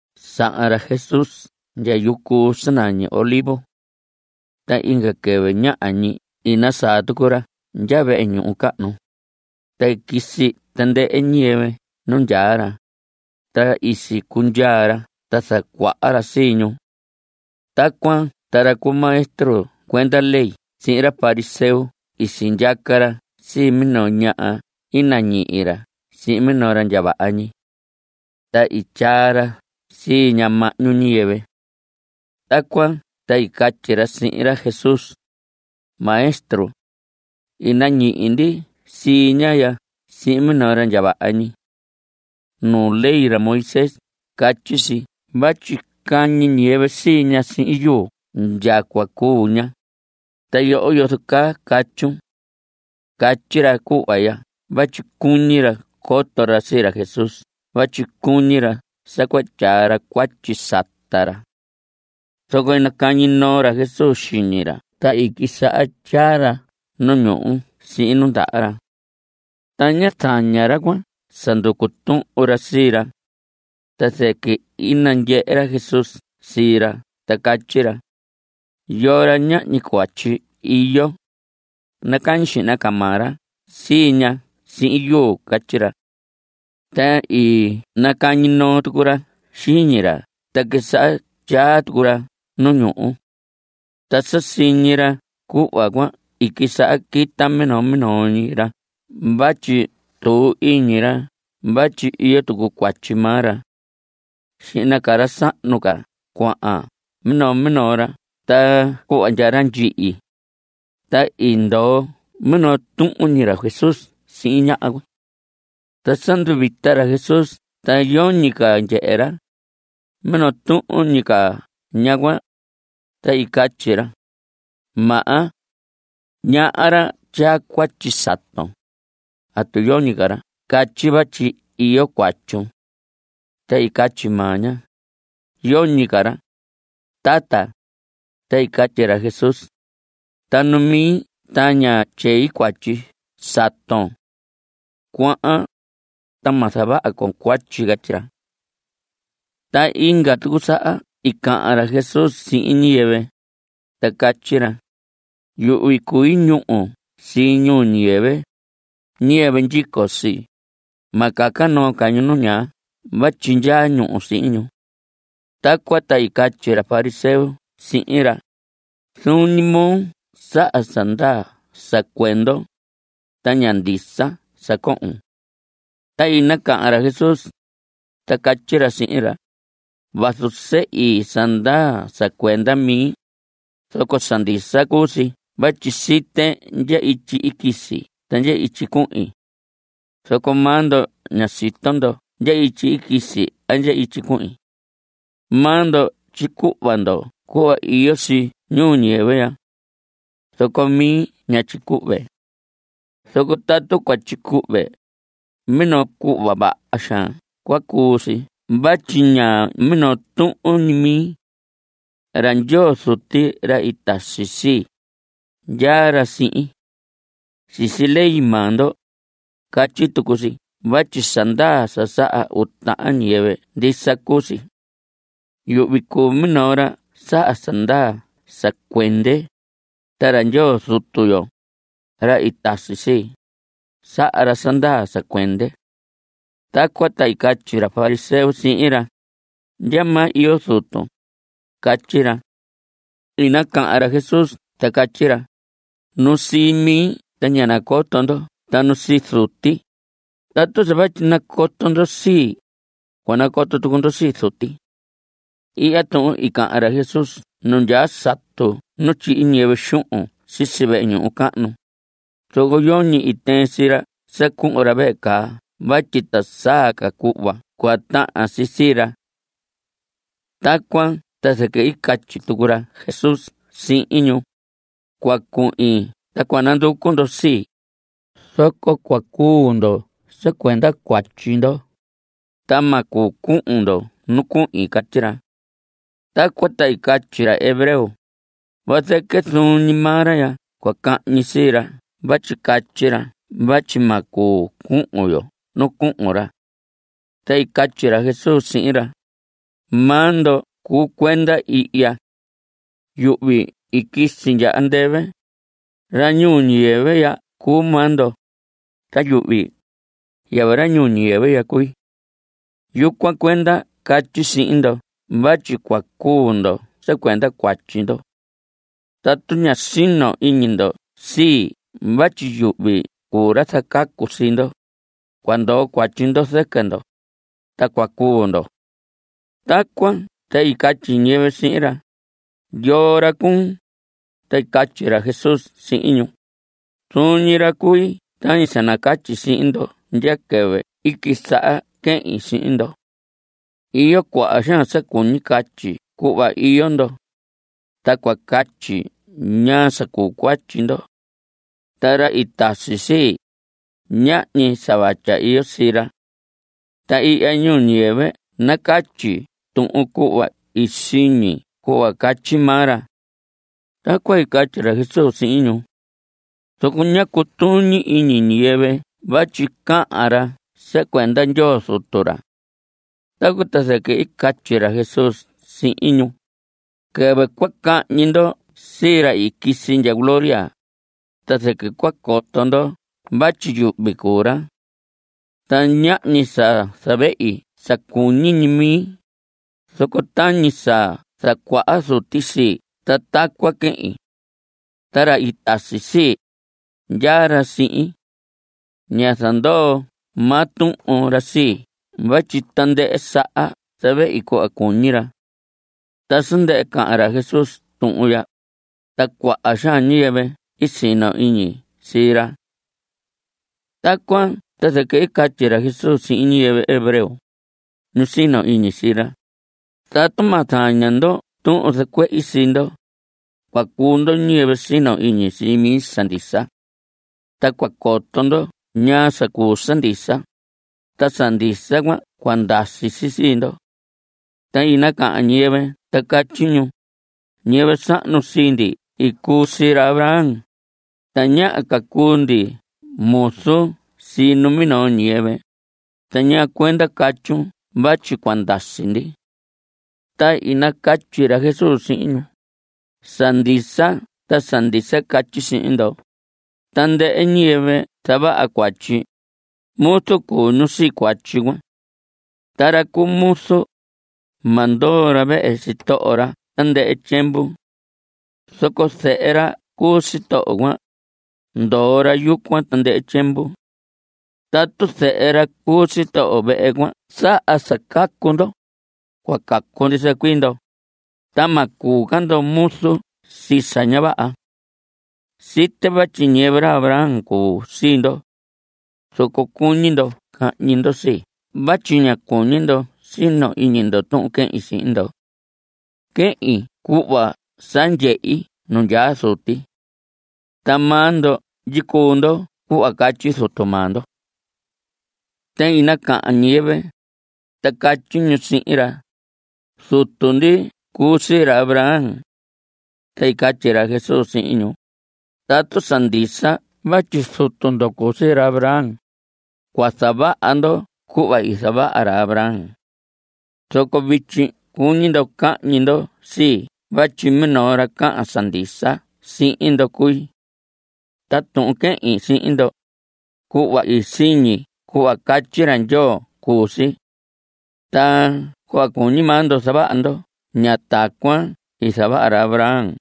Sahan ra Jesús ndya yucu sa nañi Olivos. Ta inga quɨvɨ ñaha ñi i nasaa tucu ra ndya vehe ñuhu cahnu, ta quisi tandɨhɨ ñiyɨvɨ nu ndyaa ra, ta i sicundyaa ra ta zacuaha ra sii ñu. Tacuan ta ra cu maestro cuenda ley sihin ra fariseo i sindyaca ra sii minoo ñaha i nañihi ra sihin minoo ra ndya vaha ñi. Ta i tyaa ra sii ña mahñu ñiyɨvɨ. Tacuan ta i catyi ra sihin ra Jesús: Maestro, i nañihi ndi sii ñaha ya sihin minoo ra ndya vaha ñi. Nu ley ra Moisés catyi si vatyi cañi ñiyɨvɨ sii ña sihin yuu ndya cua cuu ña. ¿Ta yoho, yozo caa catyun? Catyi ra cuhva ya vatyi cuñi ra coto ra sii ra Jesús vatyi cuñi ra sa cua tyaa ra cuatyi sata ra. Zoco i nacañi noo ra Jesús xiñi ra ta quisaha tyaa ra nu ñuhu sihin nu ndaha ra. Ta ñá zaña ra cuan sa nducu tuhun ra sii ra, ta zɨquɨ i nandyehe ra Jesús sii ra ta catyi ra: Yoo ra ñahñi cuatyi iyo, nacañi xihna ca maa ra sii ña sihin yuu. Catyi ra. Ta i nacañi noo tucu ra xiñi ra ta quisaha tyaa tucu ra nu ñuhu. Ta sa siñi ra cuhva cuan, i quisaha quita minoo minoo ñi ra vatyi tuu iñi ra vatyi iyo tucu cuatyi maa ra. Xihna ca ra sahnu ca cuahan minoo minoo ra ta cuhva ndya ra ndyihi, ta i ndoo minoo tuhun ñi ra Jesús sihin ñaha cuan. Ta sa nduvita ra Jesús ta yoñi ca ndyehe ra, minoo tuhun ñi ca ñaha cuan, ta i catyi ra: Maha, ñaha ra tyaa cuatyi saton. ¿Atu yoñi ca ra catyi vatyi iyo cuatyun? Ta i catyi maa ña: Yoñi ca ra, tata. Ta i catyi ra Jesús: Ta nu mi ta ña tyei cuatyi saton. Cuahan, ta ma zavaha con cuatyi. Catyi ra. Ta inga tucu saha i cahan ra Jesús sihin ñiyɨvɨ, ta catyi ra: Yuhvi cui ñúhu sii ñuu ñiyɨvɨ. Ñiyɨvɨ ndyico sii, ma caca noo ca ñu nu ñaa vatyi ndyaa ñúhu sihin ñu. Tacuan ta i catyi ra fariseo sihin ra: Zuun ñi moo saha sa ndaa sa cuendon, ta ña ndisa sa cohon. Ta i nacahan ra Jesús, ta catyi ra sihin ra: Vazu sehi sa ndaa sa cuenda mi, zoco sa ndisa cuu si vatyi site ndya ityi i quisi ta ndya ityi cuhin. Zoco maa ndo ña sito ndo ndya ityi i quisi a ndya ityi cuhin. Maa ndo tyicuhva ndo cuhva iyo si ñuu ñiyɨvɨ ya. Zoco mi ña tyicuhve. Zoco tatu cua tyicuhve, minoo cuhva vaha xaan cua cuu si vatyi ña minoo tuhun ñi mi. Ra Ndyoo Zuti, ra i tasi sii, ndyaa ra sihin. Sisi ley maa ndo, catyi tucu si vatyi sa ndaa sa saha uu tahan ñiyɨvɨ, ndisa cuu si. Yuhvi cuu minoo ra saha sa ndaa sa cuende, ta ra Ndyoo Zutu yo, ra i tasi sii, saha ra sa ndaa sa cuende. Tacuan ta i catyi ra fariseo sihin ra: ¿Ndyamaa iyo zutun? catyi ra. I nacahan ra Jesús ta catyi ra: Nu sii mi ta ña nacoto ndo ta nu sii Zuti. Tatu sa vatyi nacoto ndo sii, cua nacoto tucu ndo sii Zuti. Ihya tuhun i cahan ra Jesús nu ndyaa satu nu tyihi ñiyɨvɨ xuhun sisi vehe ñuhu cahnu, zoco yoñi i tɨɨn sii ra sa cuhun ra vehe caa vatyi ta saa ca cuhva cua tahan si sii ra. Tacuan ta zɨquɨ i catyi tucu ra Jesús sihin ñu: Cua cuhin ta cua nanducu ndo sii. Zoco cua cuu ndo sa cuenda cuatyi ndo, ta ma cuu cuhun ndo nu cuhin. Catyi ra. Tacuan ta i catyi ra hebreo: Vazɨquɨ zuun ñi maa ra cua cahñi sii ra vatyi catyi ra vatyi ma cuu cuhun yo nu cuhun ra. Ta i catyi ra Jesús sihin ra: Maa ndo cuu cuenda ihya. Yuhvi i quisi ndya andɨvɨ. Ra ñuu ñiyɨvɨ ya cuu maa ndo. Ta yuhvi, yɨvɨ ra ñuu ñiyɨvɨ ya cui. Yucuan cuenda catyi sihin ndo vatyi cua cuu ndo sa cuenda cuatyi ndo. Tatu ña sino iñi ndo sii vatyi yuhvi cuu ra zacacu sii ndo, cua ndoo cuatyi ndo zɨquɨ ndo, ta cua cuu ndo. Tacuan ta i catyi ñiyɨvɨ sihin ra: ¿Yoo ra cuun? Ta i catyi ra Jesús sihin ñu: Zuun ñi ra cui tañi sa nacatyi sihin ndo ndya quɨvɨ i quisaha quehin sihin ndo. Iyo cuaha xaan sa cuñi catyi cuhva iyo ndo, ta cua catyi ñaa sa cuu cuatyi ndo. Ta ra i tasi sii, ñahñi sa vatya iyo sii ra. Ta ihya ñuu ñiyɨvɨ nacatyi tuhun cuhva i siñi cuhva catyi maa ra. Tacuan i catyi ra Jesús sihin ñu. Zoco ñá cutuñi iñi ñiyɨvɨ vatyi cahan ra sa cuenda Ndyoo Zutu ra. Tacuan ta zɨquɨ i catyi ra Jesús sihin ñu: Quɨvɨ cua cañihi ndo sii ra i quisi ndya gloria, ta zɨquɨ cua coto ndo vatyi yuhvi cuu ra. Ta ñahñi sa zavehi sa cuñi ñi mi, zoco tañi sa zacuaha Zuti sii ta tacuan quehin. Ta ra i tasi sii, ndyaa ra sihin. Ña zandoo maa tuhun ra sii vatyi tandɨhɨ saha zavehi cuhva cuñi ra. Ta sa ndɨhɨ cahan ra Jesús tuhun ya, ta cuaha xaan ñiyɨvɨ i sino iñi sii ra. Tacuan ta zɨquɨ i catyi ra Jesús sihin ñiyɨvɨ hebreo, ñu sino iñi sii ra: Tatu ma zaña ndo tuhun zacuehi sii ndo, cua cuu ndo ñiyɨvɨ sino iñi sii mi sa ndisa. Ta cua coto ndo ñaa sa cuu sa ndisa, ta sa ndisa cuan cua ndasi si sii ndo. Ta i nacahan ñiyɨvɨ ta catyi ñu: Ñiyɨvɨ sahnu sii ndi cuu sii ra Abraham. Tañaha ca cuu ndi muzu sii numinoo ñiyɨvɨ. ¿Ta ñaa cuenda catyun vatyi cua ndasi ndi? Ta i nacatyi ra Jesús sihin ñu: Sa ndisa ta sa ndisa catyi sihin ndo. Tandɨhɨ ñiyɨvɨ zavaha cuatyi, muzu cuu ñu sii cuatyi cuan. Ta ra cu muzu, ma ndoo ra vehe sitoho ra tandɨhɨ tyiemvu. Zoco zehe ra cuu sitoho cuan, ndoo ra yucuan tandɨhɨ tyiemvu. Tatu zehe ra cuu sitoho vehe cuan saha sa cacu ndo, cua cacu ndisa cuii ndo, ta ma cuu ca ndo muzu sii sa ña vaha. Site vatyi ñiyɨvɨ ra Abraham cuu sii ndo. Zoco cuñi ndo cahñi ndo sii vatyi ña cuñi ndo sino iñi ndo tuhun quehin sihin ndo. Quehin cuhva sa ndyehi nu ndyaa Zuti. Ta maa ndo ndyicuu ndo cuhva catyi zutu maa ndo. Ta i nacahan ñiyɨvɨ, ta catyi ñu sihin ra: Zutu ndi cuu sii ra Abraham. Ta i catyi ra Jesús sihin ñu: Tatu sa ndisa vatyi zutu ndo cuu sii ra Abraham, cua zavaha ndo cuhva i zavaha ra Abraham. Zoco vityi cuñi ndo cahñi ndo sii vatyi minoo ra cahan sa ndisa sihin ndo cui. Ta tuhun quehin sihin ndo, cuhva i siñi cuhva catyi ra Ndyoo cuu si. Ta cuhva cuñi maa ndo zavaha ndo, ña tacuan i zavaha ra Abraham.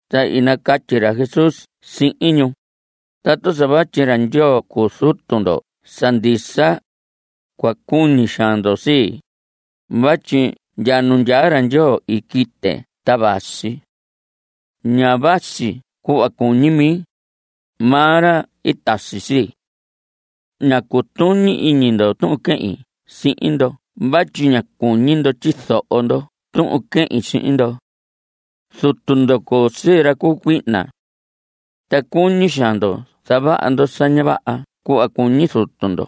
Ta i nacatyi ra Jesús sihin ñu: Tatu sa vatyi ra Ndyoo cuu Zutu ndo sa ndisa, cua cuñi xaan ndo sii, vatyi ndya nu ndyaa ra Ndyoo i quite ta vasi. Ña vasi cuhva cuñi mi. Maa ra i tasi sii. Ña cutuñi iñi ndo tuhun quehin sihin ndo vatyi ña cuñi ndo tyizoho ndo tuhun quehin sihin ndo. Zutu ndo cuu sii ra cu cuihna. Ta cuñi xaan ndo zavaha ndo sa ña vaha cuhva cuñi zutu ndo.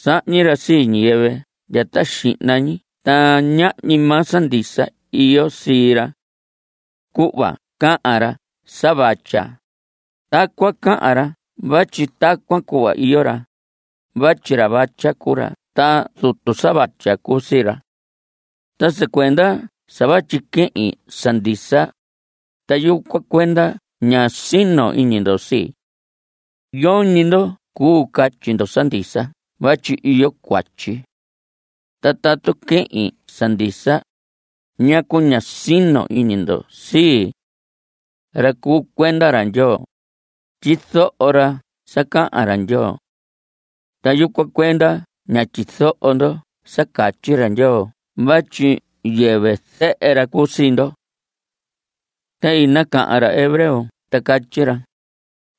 Sahñi ra sii ñiyɨvɨ ndya ta xihna ñi ta ñahñi maa sa ndisa iyo sii ra. Cuhva cahan ra sa vatya, tacuan cahan ra vatyi tacuan cuhva iyo ra, vatyi ra vatya cuu ra ta zutu sa vatya cuu sii ra. Ta sa cuenda sa vatyi quehin sa ndisa, ta yucuan cuenda ña sino iñi ndo sii. Yoñi ndo cuu catyi ndo sa ndisa vatyi iyo cuatyi. Ta tatu quehin sa ndisa, ¿ñacu ña sino iñi ndo sii? Ra cuu cuenda ra Ndyoo, tyizoho ra sa cahan ra Ndyoo. Ta yucuan cuenda ña tyizoho ndo sa catyi ra Ndyoo vatyi yɨvɨ zehe ra cuu sii ndo. Ta i nacahan ra hebreo ta catyi ra: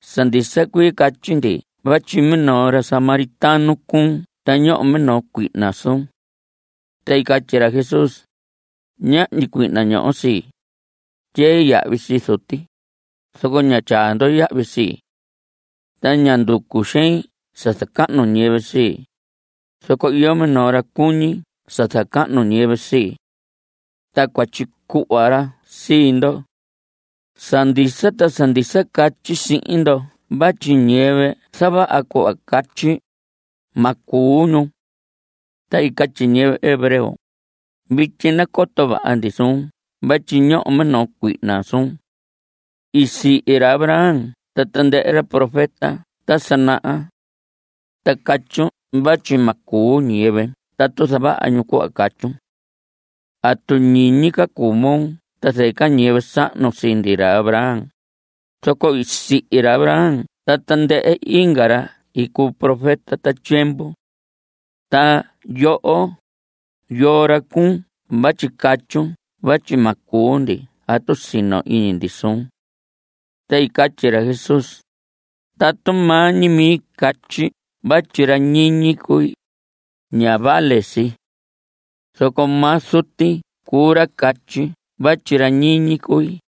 Sa ndisa cuii catyi ndi vatyi minoo ra samaritano cuun ta ñoho minoo cuihna suun. Ta i catyi ra Jesús: Ñahñi cuihna ñoho sii. Tyei yahvi sii Zuti, zoco ña tyaa ndo yahvi sii. Ta ña nducu xein sa zacahnu ñiyɨvɨ sii, zoco iyo minoo ra cuñi sa zacahnu ñiyɨvɨ sii. Ta cua tyicuhva ra sii ndo. Sa ndisa ta sa ndisa catyi sihin ndo vatyi ñiyɨvɨ zavaha cuhva catyi, ma cuu ñu. Ta i catyi ñiyɨvɨ hebreo: Vityi nacoto vaha ndi suun vatyi ñoho minoo cuihna suun. I sihi ra Abraham ta tandɨhɨ ra profeta ta sa naha. Ta catyun vatyi ma cuu ñiyɨvɨ tatu zavaha ñu cuhva catyun. ¿Atu ñiñi ca cuu moo ta zɨquɨ ñiyɨvɨ sahnu sii ndi, ra Abraham? Zoco i sihi ra Abraham ta tandɨhɨ inga ra i cuu profeta ta tyiemvu. Ta yoho, ¿yoo ra cuun vatyi catyun vatyi ma cuu ndi tatu sino iñi ndi suun? Ta i catyi ra Jesús: Tatu maa ñi mi catyi vatyi ra ñiñi cui, ña vale si. Zoco maa Zuti cuu ra catyi vatyi ra ñiñi cui.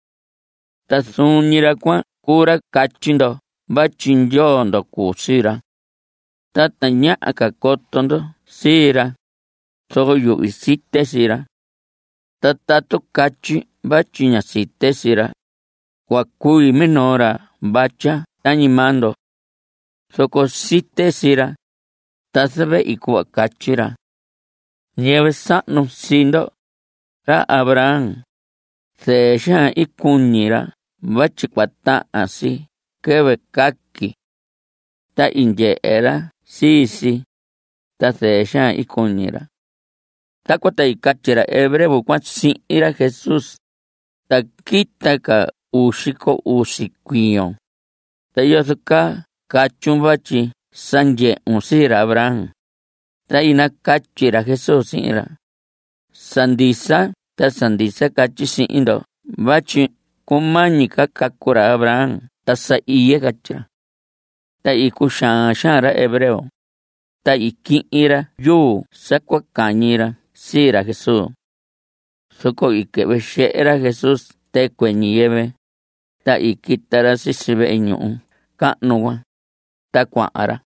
Ta zuun ñi ra cuan cuu ra catyi ndo vatyi Ndyoo ndo cuu sii ra. Ta tañaha ca coto ndo sii ra, zoco yuhvi site sii ra. Ta tatu catyi vatyi ña site sii ra, cua cui minoo ra vatya tañi maa ndo. Zoco site sii ra, ta zavehi cuhva catyi ra. Ñiyɨvɨ sahnu sii ndo, ra Abraham, zɨɨ xaan i cuñi ra vatyi cua tahan si quɨvɨ caqui. Ta i ndyehe ra sii si, ta zɨɨ xaan i cuñi ra. Tacuan ta i catyi ra hebreo cuan sihin ra Jesús: Ta quita ca uu xico usi cuiyon, ta ¿yozo caa catyun vatyi sa ndyehun sii ra Abraham? Ta i nacatyi ra Jesús sihin ra: Sa ndisa ta sa ndisa catyi sihin ndo vatyi cumañi ca cacu ra Abraham ta sa iye. Catyi ra. (Ta i cuxaan xaan ra hebreo), ta i quihin ra yuu sa cua cañi ra sii ra Jesús. Zoco i quɨhvɨ xehe ra Jesús tɨcuɨ ñiyɨvɨ, ta i quita ra sisi vehe ñuhu cahnu cuan, ta cuahan ra.